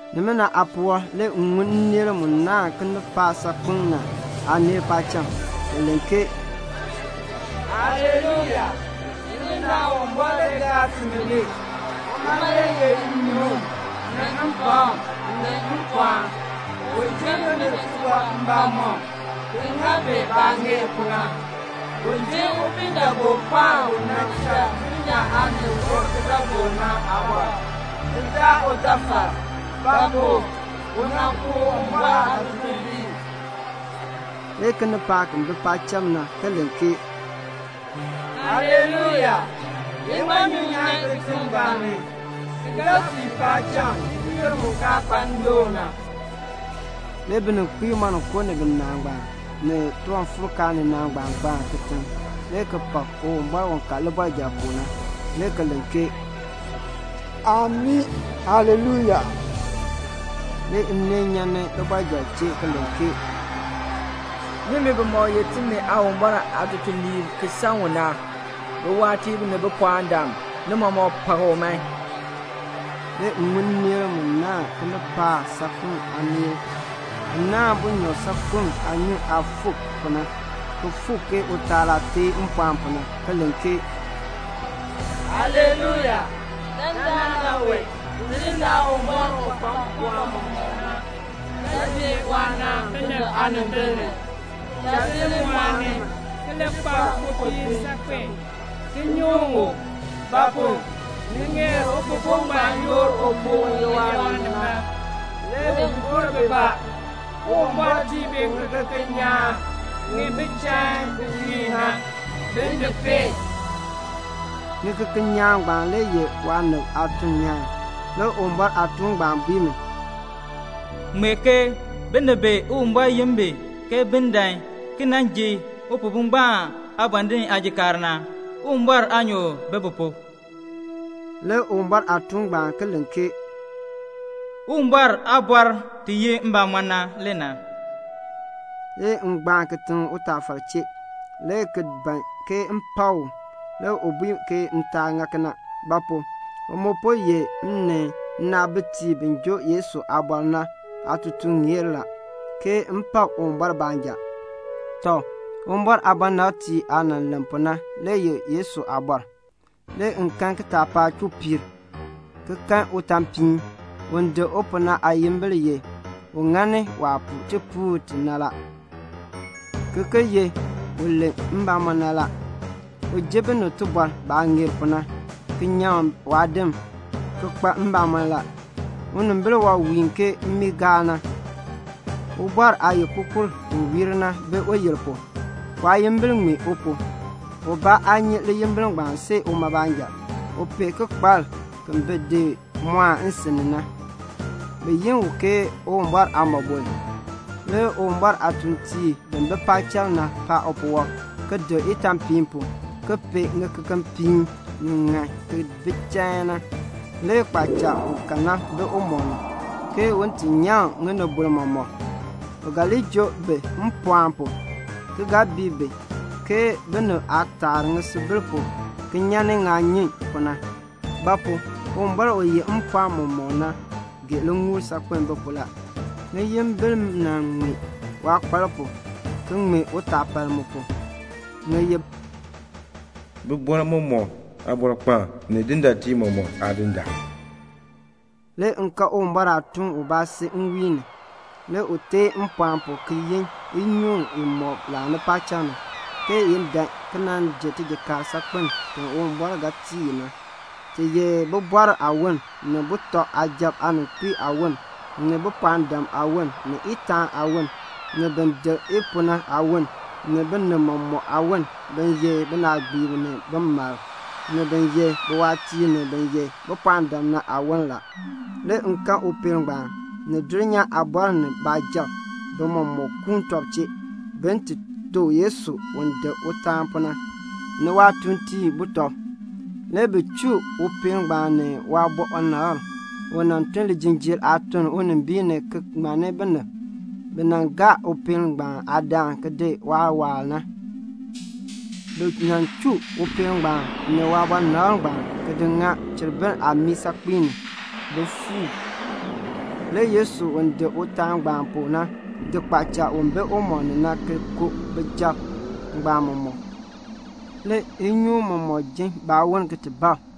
Nimina aapuwɔb le m ŋun nneel mu naahn kinipaak saakpeŋ na aaneel paacham. Bi len ke "Haleluya! Tidindaan Uwumbɔr le cha ti ŋmar. Uma le yeh nnyuŋ ni mpakm ni mpɔɔn. U ji binib tibɔr mbamɔm ki ŋa bi baah ŋeer pu na. U ji upiidaagookpaan u nan cha dulnyaa aanib gɔr kidaagook na aabɔr, ki daa utafal; ba pu? u nan ku Uwumbɔr aatutuliib." Le kinipaak bi bi paacham na ki len ke "Haleluya! Iŋmanyu nyan kitiŋ ngbaan ki ga fii paacham n-yoonn mu kaa kpa ndoon na." Le bininkpiib moninko ni binaa ngbaan, ni tiwanfuurkaan ninaa ngbaan gbaan kitiŋ le ki pak Uwumbɔr u ka libɔrjal pu na, le ki len ke "Amii! Haleluya!" Le nneel nyan libɔrjal chee ki len ke "Nimi bimɔk ye timi Aawumbɔr aatutuliib ki san u na, biwaatiib ni bipɔɔndam, ni mɔmɔk pak u man." Le m ŋun nneel mu naahn kinipaak saakpeŋ aaneel na, ki naahn bunyɔb saakpem aanyun aah fuuk pu na, ki fuuk ke utaal aah teen mpɔɔn pu na, ki len ke "Haleluya! Dandana wee Tidindaan Uwumbɔr u kpa mpɔɔn mɔmɔk na ga ji waanaan binib aanimbil ni. Cha ti li mɔɔni ki li kpa mpopiin saakpen ki nyuŋ u; ba pu? ni ŋeer Upihbo ngbaan yoor upuu u ye waanib na. Le bi gor bibaa. Uwumbɔr tii bi ŋikeken nyaan ŋi bi chain ki wiin na, bi di peen." (Ŋikeken nyaan ngbaan le ye waanib aatuln nyaan.) Le Uwumbɔr aatuun ngbaan bui mi, "Ŋmee ke: Binib bi Uwumbɔr yin bi ke bin dan ki nan ji Upihbo ngbaan aabɔndinn aajikaar na, Uwumbɔr aanyoor bi bi pu." Le Uwumbɔr aatuun ngbaan ki len ke "Uwumbɔr aaliin i ye mbamɔn na le na." Le m gbaan kitiŋ utaafar chee, le ki ban ke m pak u. Le u bui ke m taa ŋa kena; ba pu? u mu po ye m ni nnaabitiib bi joo Yesu aaliin na aatutuŋeer, ke m pak Uwumbɔr baanja. Tɔ, Uwumbɔr aabɔnabtiib aah len pu na le ye Yesu aabɔr. Le m kan kitaapaak chuu piir, ki kan utaapiin. Un dik u pu na aayimbil ye, "U ŋani waah puu tipuul ti na la" ki ki ye, "U len mbamɔn na la." U ji binib tibɔr baah ŋeer pu na, ki nyaŋ waadim, ki kpa mbamɔn la. Unimbil wɔb wiin ke mmiigaal na. Ubɔr aayikpupur ti wiir na bi uyil pu. Waayimbil ŋmee u pu. Ubaa aa nyi liyimbil ngbaan see uma baanja. U pee kikpalk ki mɔɔn nsin ni na. Bi yi u ke "Uwumbɔr Aaliin." Le Uwumbɔr aatuuntiib bi bi paacham na paan upuwɔb, ki dik itaanpiin pu, ki pee ŋikekepiin ŋi ŋan ki bi chain na. Le kpaacha u ka na bi umɔb ni, ke un ti nyaŋ ŋinibol mɔmɔk. U ga li joo bi mpɔɔn pu, ki ga bii bi ke binib aah taa ŋisubil pu ki nyan ŋaanyun pu na; ba pu? Uwumbɔr u yeh mpɔɔn mɔmɔk na gee liŋuul saakpen bi pu la. Ŋiyimbil ŋmee waakpalk pu ki ŋmee utaapaln mu pu. Ŋi ye "Bibɔrb mɔmɔk Aabɔrkpaan ni dindaatiib mɔmɔk Aadindaan." Le m kan Uwumbɔr aatuun ubaa si nwiin ni. Le u teen mpɔɔn pu ki yin inyoon imɔk laani paacham na, ke i dan ki nan ji tijikaar saakpen ti Uwumbɔr ga tii i na, ti ye bibɔrb aawon, ni sujatiib aaninkpiib aawon, ni bipɔɔndam aawon, ni itaan aawon, ni bin dik i pu na aawon, ni binib mɔmɔk aawon, bin ye binaagbiib ni bimalb, ni bin ye biwaatiib ni bin ye bipɔɔndam na aawon. Le m kan upeel ngbaan, ni dulnyaa aabɔrb ni baasujatiib, bi mɔmɔk kuun tɔb chee, bin ti to Yesu u dik utaan pu na, ni waatuuntiib butɔb. Le bi chuu upeel ngbaan ni waabɔnabr u nan tun lijinjiir aatun unimbiin ni ki ŋmanni binib bi nan gaa upeel ngbaan aadaan ki dii waawaal na. Bi chuu upeel ngbaan ni waabɔnabr ngbaan ki di ŋa cheribir aamii saakpiin ni, bi beenin fu. Le Yesu u dik utaan ngbaan pu na di kpaacha u bi umɔb ni na ki ku baasujatiib ngbaan mɔmɔk. Le inyoon mɔmɔk jin baawon ki bab.